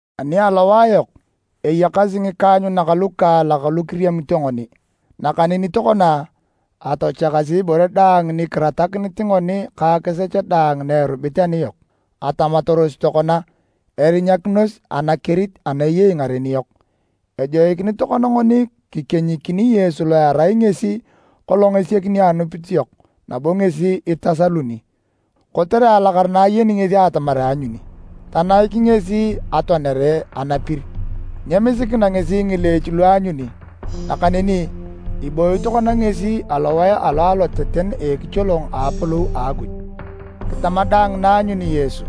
Ani alowae yok, eyakasi ngikaanyunak lukaalak lu kiriamito ngoni, nakaneni tokona, atochakasi ibore daang ni kiratakinit ngoni ka akisech daang na erubit aniyok, atamataros tokona erinyakinos anakerit ana eyei ngaren yok. Ejoikinit tokona ngoni kikenyikini Yesu lo erai ngesi kolong esiakini anupit yok nabo ngesi itasaluni. Kotere alakara na ayeni ngesi atamar aanyuni, tanaik ngesi atoanere anapir! Nyemisikina ngesi ngileech lu aanyuni, nakaneni ibooyi tokona ngesi alowae alo aloteten a ekicholong a apolou a Akuj. Kitama daang na aanyuni Yesu,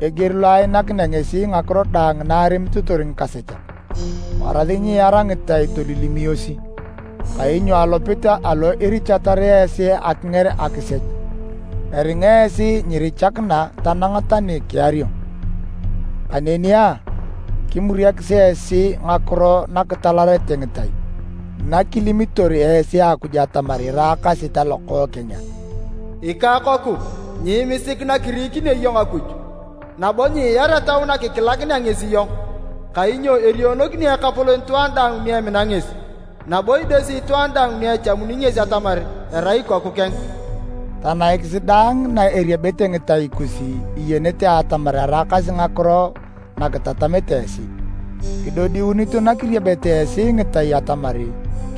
eger lo anaikinea ngesi ngakiro daang na aremitotor ngikasechak! Warasi nyiiar ngitai tolilimiosi. Kainyo alopit alo irichatar esi akinger akisech, eringa esi nyirichakina tanang tani kiario. Kaneni a, kimuriakis esi ngakiro nakitalakarete ngitai nakilimitor esi Akuj atamar iraakasi talokookeng a? “Ikakoku, nyiimisik nakirikinio iyong Akuj, nabo nyiar etau nakikilakinea ngesi iyong. Kainyo erionokini Ekapolon itwaan daang ni emina ngesi, nabo idesi itwaan daang ni echamuni ngesi atamar erai ikoku keng.” Tanaikisi daang na eriebete ngitai kus iyenete atamar eraakasi ngakiro na kitatamete esi, idodiunito na kiriebete esi ngitai atamar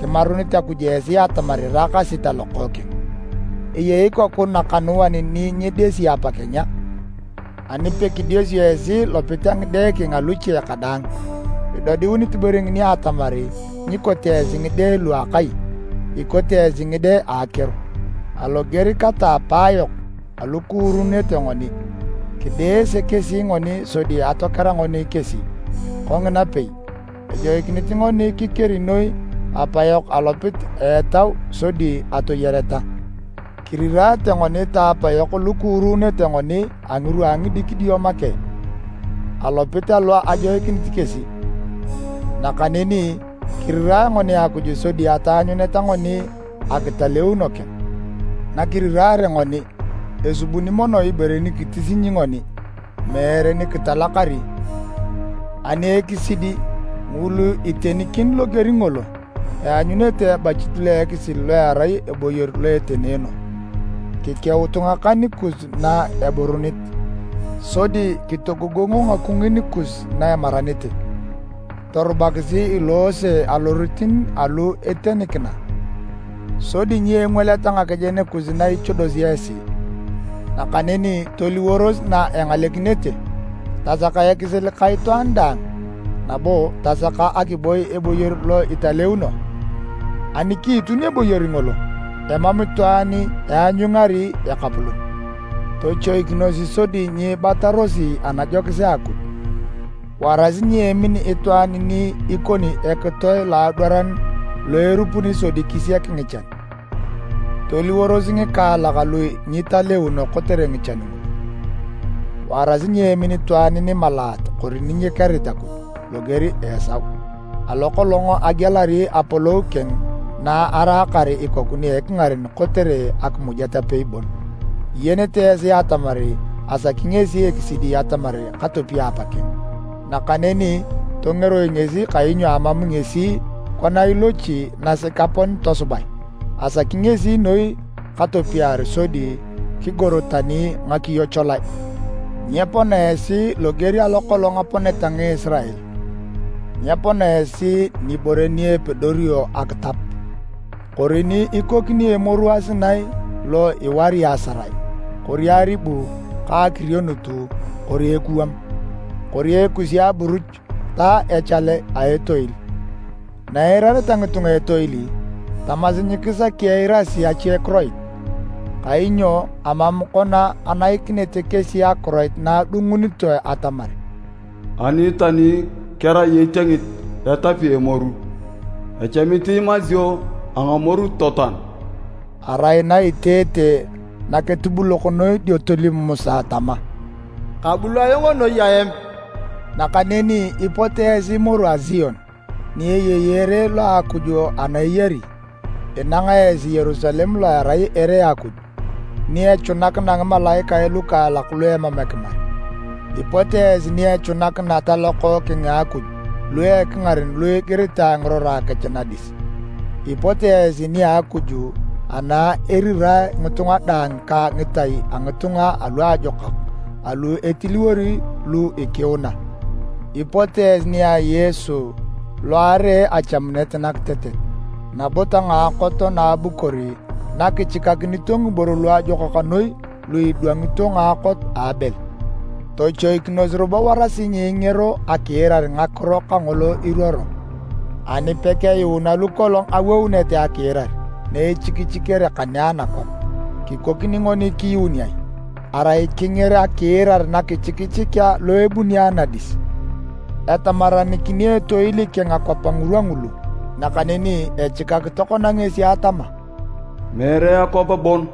kimarunit Akuj esi atamar iraakasi talokookeng. Eyei ikoku nakanuan ni nyidesit apakeng a? Ani pakidesio esi lopit a ngide keng aluche kadaang, idodiunit ibore ngini atamar nyikote esi ngide lu a akai, ikote esi ngide a akeor. Aloger kata a apayok alu kuurunete ngoni, kideese kesi ngoni sodi atokera ngoni kesi. Kongina pei, ejoikinit ngoni kikeri noi Apayok alopit a etau sodi atoyareta! Kiriraate ngoni ta apayok lu kuurunete ngoni a ngirwa a ngidikidio make, alopit alo ajoikinit kesi, nakaneni kirirae ngoni Akuj sodi ataanyuneta ngoni akitaleuno keng. Nakiriraare ngoni, esubuni mono ibore nikitisinyi ngoni, meere ni kitalakari. Ani ekisidi, ngulu etenikin loger ngolo, eanyunete ebachit lo ekisil lo erai eboyor lo etenoono. Kikeutu ngakan kus na eburunit, sodi kitogogongo ngakungin kus na emaranete! Torubakisi iloose alorotin alu itenikina, sodi nyengwaleta ngakejen kus na ichodosi esi, nakaneni toliworos na engalekinete. Tasaka akisil ka itwaan daang, nabo tasaka akiboi eboyor lo italeuno, ani kiitun eboyor ngolo, emam itwaan eanyungari Ekapolon. Tochoikinos sodi nyiibatarosi anajokis a Akuj. Warasi nyeemin itwaan ni ikoni ekitoe loadwaran lo erupuni sodi kisiak ngichan, toliworos ngikaalak lu nyitaleuno kotere ngichan ngulu. Warasi nyeemin itwaan nimalaat kori ni nyekerit Akuj loger a Esau, alo kolong agialari apolou keng na araakar ikoku ni ekingaren kotere akimujet apei bon. Iyenete esi atamar asaki ngesi ekisidi atamar katopia apakeng, nakaneni tongeroi ngesi kainyo amam ngesi kona ilochi nasek apon tosubae. Asaki ngesi noi katopiar sodi kigor tani ngakiyo cholae. Nyepona esi loger lo kolong aponeta Ngisirael. Nyepona esi nibore ni epedorio akitap, kori ni ikoni emoru a Sinai lo ewari asarae, kori aribu ka akirionut kori ekuwam, kori ekuse a aburuch ta echale a etoil. Na eirareta ngitunga etoil, tamasi nyikisaki eirasi achekiroit, kainyo amam kona enaikinete kesi akiroit na adungunitoe atamar, “Ani tani kerai etiengit etapi emoru, echamit imasio a ngamoru totoan.” Arai na eteete naketubulok noi dio tolim Musa tama, “Kabul ayong noi aem!” Nakaneni ipot esi moru a Sion, ni eyei ere lo a Akuj ana eyari. Inanga esi Yerusalem lo erai ere a Akuj, ni echunakina ngimalaikae lukaalak lu emam ekimar. Ipot esi ni echunakina talokookeng a Akuj lu a ekingaren lu igiritae ngirora kech nadis. Ipot esi nia Akuj ana irirae ngitunga daang ka ngitai a ngitunga aluajokak alu etiliwor lu ikiuna. Ipot esi nia Yesu alo aree achamunet nakitetet nabo ta ngaakot na abukor na kichikakinito ngiboro luajokak noi lu idwangito ngaakot a Abel. Tochoikinos robo warasi nyiingero akiirar ngakiro kangolo iruoro. Ani pekeyuuna lu kolong awounete akiirar na echikichikere kane anakwap, kikokini ngoni kiyuun ai, arai kinger akiirar nakichikichikea lo abuni anadis? Etamaranikini etoil keng akwap ngirwa ngulu. Nakaneni echikak tokona ngesi atama, “Meere akwap bon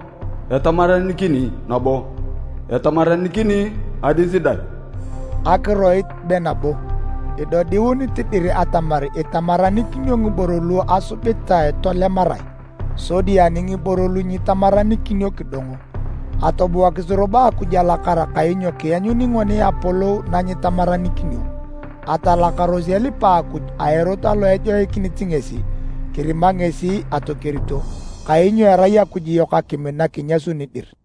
etamaranikini nabo, etamaranikini adis dang.” Akiroit be “nabo” idodiunit dir atamar itamaranikinio ngiboro lu asubitae tolemarae, sodi ani ngiboro lu nyitamaranikinio, kidongo. Atobuakisi robo Akuj alakara kainyo kianyuni ngoni Apolou na nyitamaranikinio. Atalakaros elipa Akuj a erot alo ejoikinit ngesi, kirima ngesi atokerito, kainyo erai Akuj yok akim nakinyasuni dir.